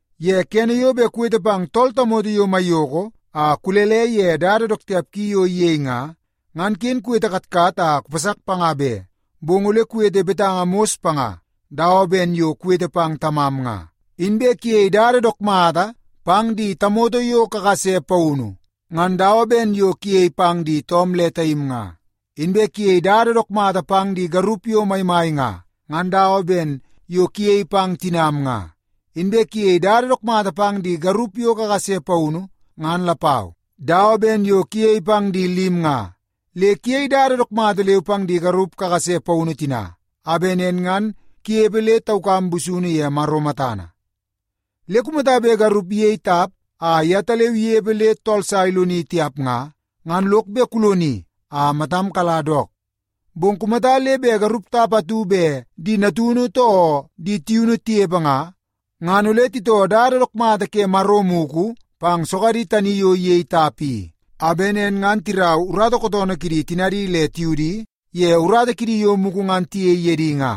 Ye kene yo bet kuwete pang tool tamoto yo maiyoko a kulele ye dada dook tiap ki yo iyei nga, ngan ken kuwete katkat a kupasak panga be. Bong ole kuwete betanga mos panga dawa ben yo kuwete pang tamam nga. Inbe kuyei dada dook mata pang di tamoto yo kakase paunu, ngan dawa ben yo kuyei pang di toom le taim nga. Inbe kuyei dada dook mata pang di garup yo maimai nga, ngan dawa ben yo kuyei pang tinam nga. Inbe kuyei dada dook mata pang di garup yo kakase paunu ngan lapau, dawa ben yo kuyei pang di lim nga. Le kuyei dada dook mata leu pang di garup kakase paunu tina, a bet nen ngan kunepe le taukam busunu ye Maro matana. Le kumata bet garup iyei tap a yetaleu inepe le tool sa iloni tiap nga, ngan lok bet kuloni a matam kala dook. Bong kumata le bet garup tap atu bet di natunu too di tiunu tinepe nga, ngan ole titoo dada dook mata ke Maro mugu pang sogadi tani yo iyei tap i. A bet nen ngan tirau urata kootoonoo kidi tinadi le tiudi ye urata kidi yo mugu ngan tiyei ye di nga.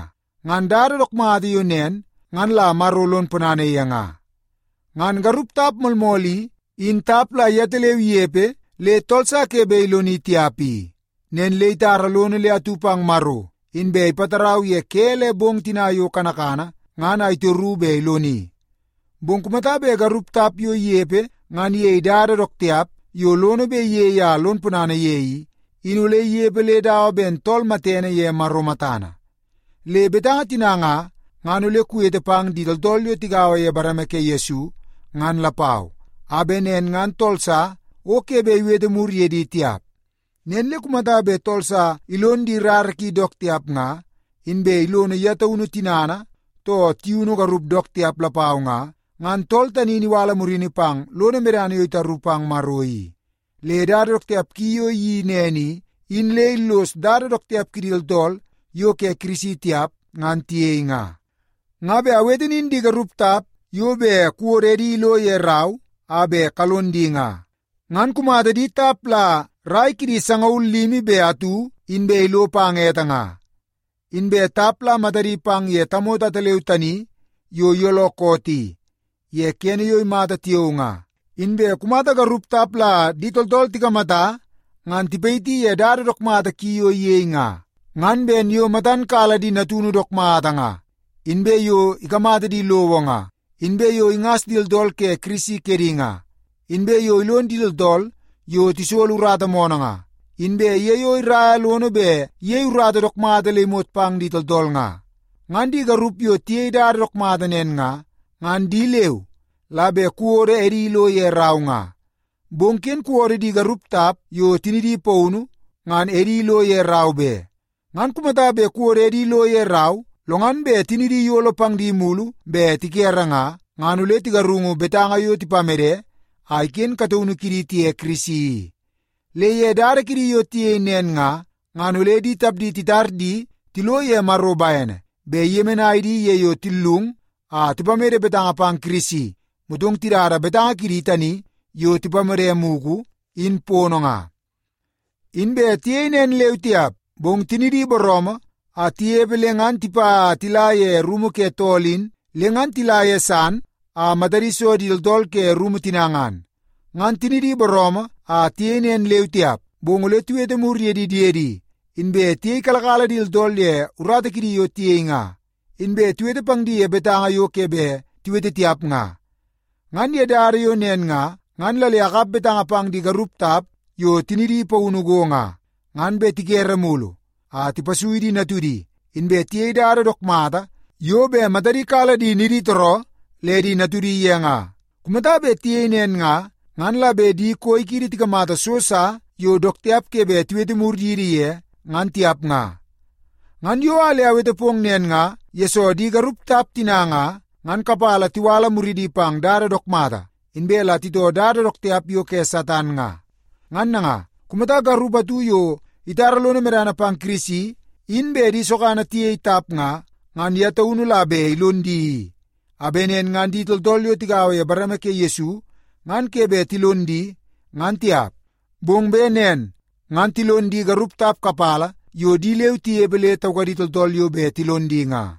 Ngan dada dook mata yo nen, ngan la Maro lon ponana ye nga. Ngan garup tap moolmool i, in tap la yetaleu inepe le tool sa ke bet iloni tiap i. Nen le itara lono le atu pang Maro, inbe ipatarau ye ke le bong tina yo kanakana ngan a itoru bet iloni. Bong kumata bet garup tap yo inepe ngan iyei dada dook tiap yo lono bet iyei a lon ponana ye i, in ole inepe le dawa ben tool matene ye Maro matana. Le betanga tina nga, ngan ole kuwete pang di tooltool yo tigaua ye bareme ke Yesu ngan lapau, a bet nen ngan tool sa o ke bet iwete mur ye di tiap. Nen le kumata bet tool sa ilon di rara ki dook tiap nga, inbe ilono ye taunu tinana too tiunu garup dook tiap lapau nga, ngan tool tani in iwala murini pang lono medana yo itaru pang Maro i. Le dada dook tiap ki yo iyeii nen i, in le illos dada dook tiap kidi tooltool yo ke Kirisi tiap ngan tiyei nga. Nga bet awete nin di garup tap yo bet kuwodo edi ilo ye rau a bet kalon di nga, ngan kumata di tap la rai kidi sangaul limi be atu inbe ilo pang ete nga. Inbe tap la matana pang ye tamoto ataleu tani yo iyooloo koot i ye kene yo imata tiao nga. Inbe kumata garup tap la di tooltool tikamata ngan tipayiti ye dada dook mata ki yo iyei nga, ngan ben yo matan kala di natunu dook mata nga, inbe yo ikamata di lowo nga, inbe yo ingas di tooltool ke Kirisi kedi nga, inbe yo ilon di tooltool yo tisolo urata moonoo nga, inbe ye yo iraia lono bet iyei urata dook mata le imot pang di tooltool nga. Ngan di garup yo tiyei dada dook mata nen nga, ngan di leu la bet kuwodo edi ilo ye rau nga. Bong ken kuwodo di garup tap yo tinidi paunu, ngan edi ilo ye rau be. Ngan kumata bet kuwodo edi lo ye rau, lo ngan bet tinidi iyolo pang di mulu bet tikere nga, ngan ole tigarungu betanga yo tipamede a iken kataunu kidi tiye Kirisi i. Le ye dada kidi yo tiyei nen nga, ngan ole di tapdi titar di tilo ye Maro bene bet iyemenai di ye yo tillung a tipamede betanga pang Kirisi, motong tidada betanga kidi tani yo tipamede mugu, in pono nga. Inbe tiyei nen leu tiap, bong tinidi booroomoo a tinepe le ngan tipa a tila ye rumu ke tool in, le ngan tila ye san a matadi so di tooltool ke rumu tina ngan. Ngan tinidi booroomoo a tiyei nen leu tiap, bong ole tiwete mur ye di diedi, inbe tiyeikalakala di tooltool ye urata kidi yo tiyei nga, inbe tiwete pang di ye betanga yo ke bet tiwete tiap nga. Ngan ye dada yo nen nga, ngan la le akap betanga pang di garup tap yo tinidi paunu go nga, ngan bet tikere mulu a tipasui di natudi, inbe tiyei dada dook mata yo bet matadi kala di niditooroo le di natudi ye nga. Kumata bet tiyei nen nga, ngan la bet di koi kiidi tikamata so sa yo dook tiap ke bet tiwete mur yidi ye, ngan tiap nga. Ngan yo a le awete pong nen nga, yesoo di garup tap tina nga, ngan kapala tiwala muridi pang dada dook mata, inbe la titoo dada dook tiap yo ke Satan nga. Ngan nanga, kumata garup atu yo itara lono medana pang Kirisi, in bet di sogana tiyei tap nga, ngan ye taunu la bet ilon di i, a bet nen ngan di tooltool yo tigaua ye bareme ke Yesu ngan ke bet tilon di, ngan tiap. Bong bet nen ngan tilon di garup tap kapala yo di leu tinepe le taukadi tooltool yo bet tilon di nga.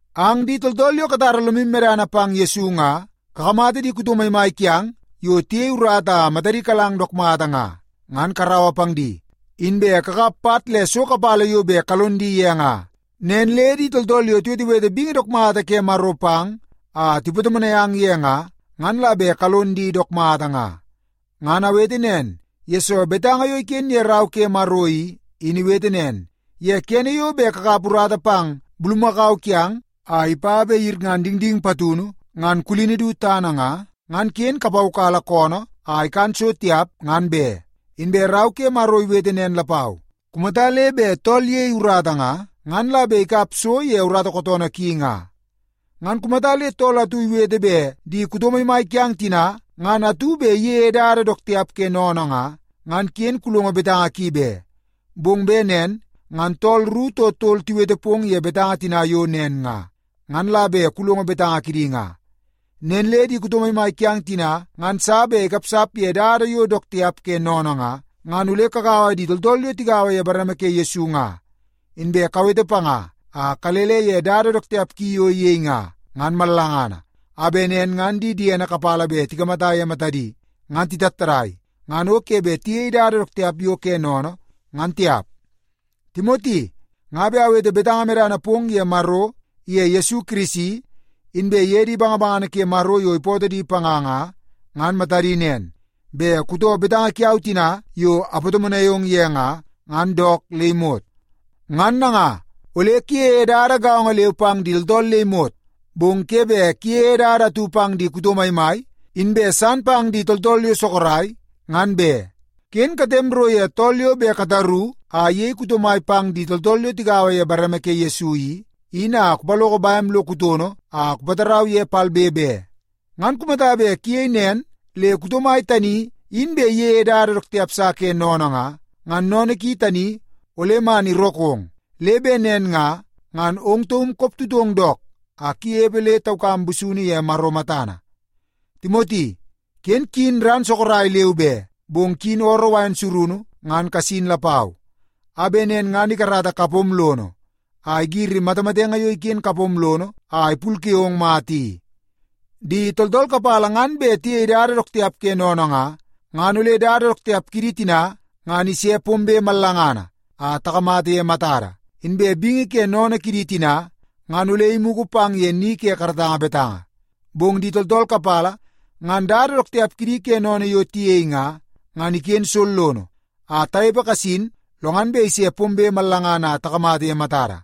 Ang di tooltool yo katara lomu medana pang Yesu nga, kakamata di kuto maimai kiang yo tiyei urata a matadi kalang dook mata nga, ngan karaua pang di, inbe kakap pat le so kapala yo bet kalon di ye nga. Nen le di tooltool yo tiwetewete bingi dook mata ke Maro pang a tipatomonai ang ye nga, ngan la bet kalon di dook mata nga. Ngan awete nen, yesoo betanga yo iken ye Rau ke Maro i, in iwete nen, “Ye kene yo bet kakap urata pang bulumakau kiang a ipa bet iyirngan dingding patunu ngan kulini idu tana nga, ngan ken kupaukala koonoo a ikan so tiap ngan be.” Inbe Rau ke Maro iwete nen lapau, “Kumata le bet tool iyei urata nga, ngan la bet ikap so ye urata kootoonoo ki nga.” Ngan kumata le tool atu iwete bet di kuto maimai kiang tina ngan atu bet iyeie dada dook tiap ke sennene nga, ngan ken kulongo betanga ki be. Bong bet nen ngan tool ru too tol tiwete pong ye betanga tina yo nen nga, ngan la bet kulongo betanga kidi nga. Nen le di kuto maimai kiang tina ngan sa bet ikapsap ye dada yo dook tiap ke sennene nga, ngan ole kugaua di tooltool yo tigaua ye bareme ke Yesu nga, inbe kuwete panga a kulele ye dada dook tiap ki yo iyei nga, ngan mallangana, a bet nen ngan di diene kapala bet tikamata ye matadi, ngan titattadai, ngan o ke bet tiyei dada dook tiap yo ke sennene, ngan tiap. Timoti, nga bet awete betanga medana pong ye Maro iye Yesu Kirisi, inbe ye di bangabangana ke Maro yo ipootoo di panga nga, ngan matadi nen, bet kutoo betanga kiau tina yo apatomonai ong ye nga, ngan dook le imot. Ngan nanga, ole kuyeie dada gaongo leu pang di tooltool le imot, bong ke bet kuyeie dada atu pang di kuto maimai, inbe san pang di tooltool yo sorok ngan be. Ken katem ro ye tool yo bet kataru a iyei kuto mai pang di tooltool yo tigaua ye bareme ke Yesu i, in a kupaloko bem lo kutono a kupatarau ye palbe be. Ngan kumata bet kuyei nen le kuto mai tani, in bet iyeie dada dook tiap sa ke sennene nga, ngan sennene ki tani ole man irookong. Le bet nen nga, ngan ong taum koptutong dook a kunepe le taukam busunu ye Maro matana. Timoti, ken kuyin ran sorok leu be, bong kuyin ooroo wain surunu ngan kasin lapau, a bet nen ngan ikarata kapom lono a igiri matamatenge yo iken kapom lono a ipulke ong mata i. Di tooltool kapala ngan bet tiyei dada dook tiap ke sennene nga, ngan ole dada dook tiap kidi tina, ngan ise pombe mallangana a takamata ye matada. Inbe bingi ke sennene kidi tina, ngan ole imugu pang ye ni ke karatanga betanga. Bong di tooltool kapala ngan dada dook tiap kidi ke sennene yo tiyei nga, ngan iken sollono a tanepe kasin lo ngan bet ise pombe mallangana a takamata ye matada.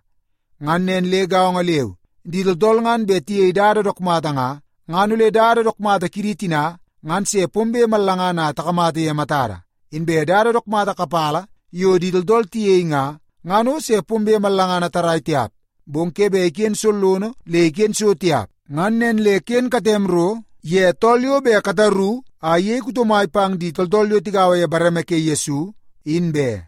Ngan nen le gaongo leu, di tooltool ngan bet tiyei dada dook mata nga, ngan ole dada dook mata kidi tina, ngan se pombe mallangana a takamata ye matada. Inbe dada dook mata kapala yo di tooltool tiyei nga, ngan o se pombe mallangana tarrai tiap, bong ke bet iken sollono le iken so tiap. Ngan nen le ken katem ro ye tool yo bet kataru a iyei kuto mai pang di tooltool yo tigaua ye bareme ke Yesu in be.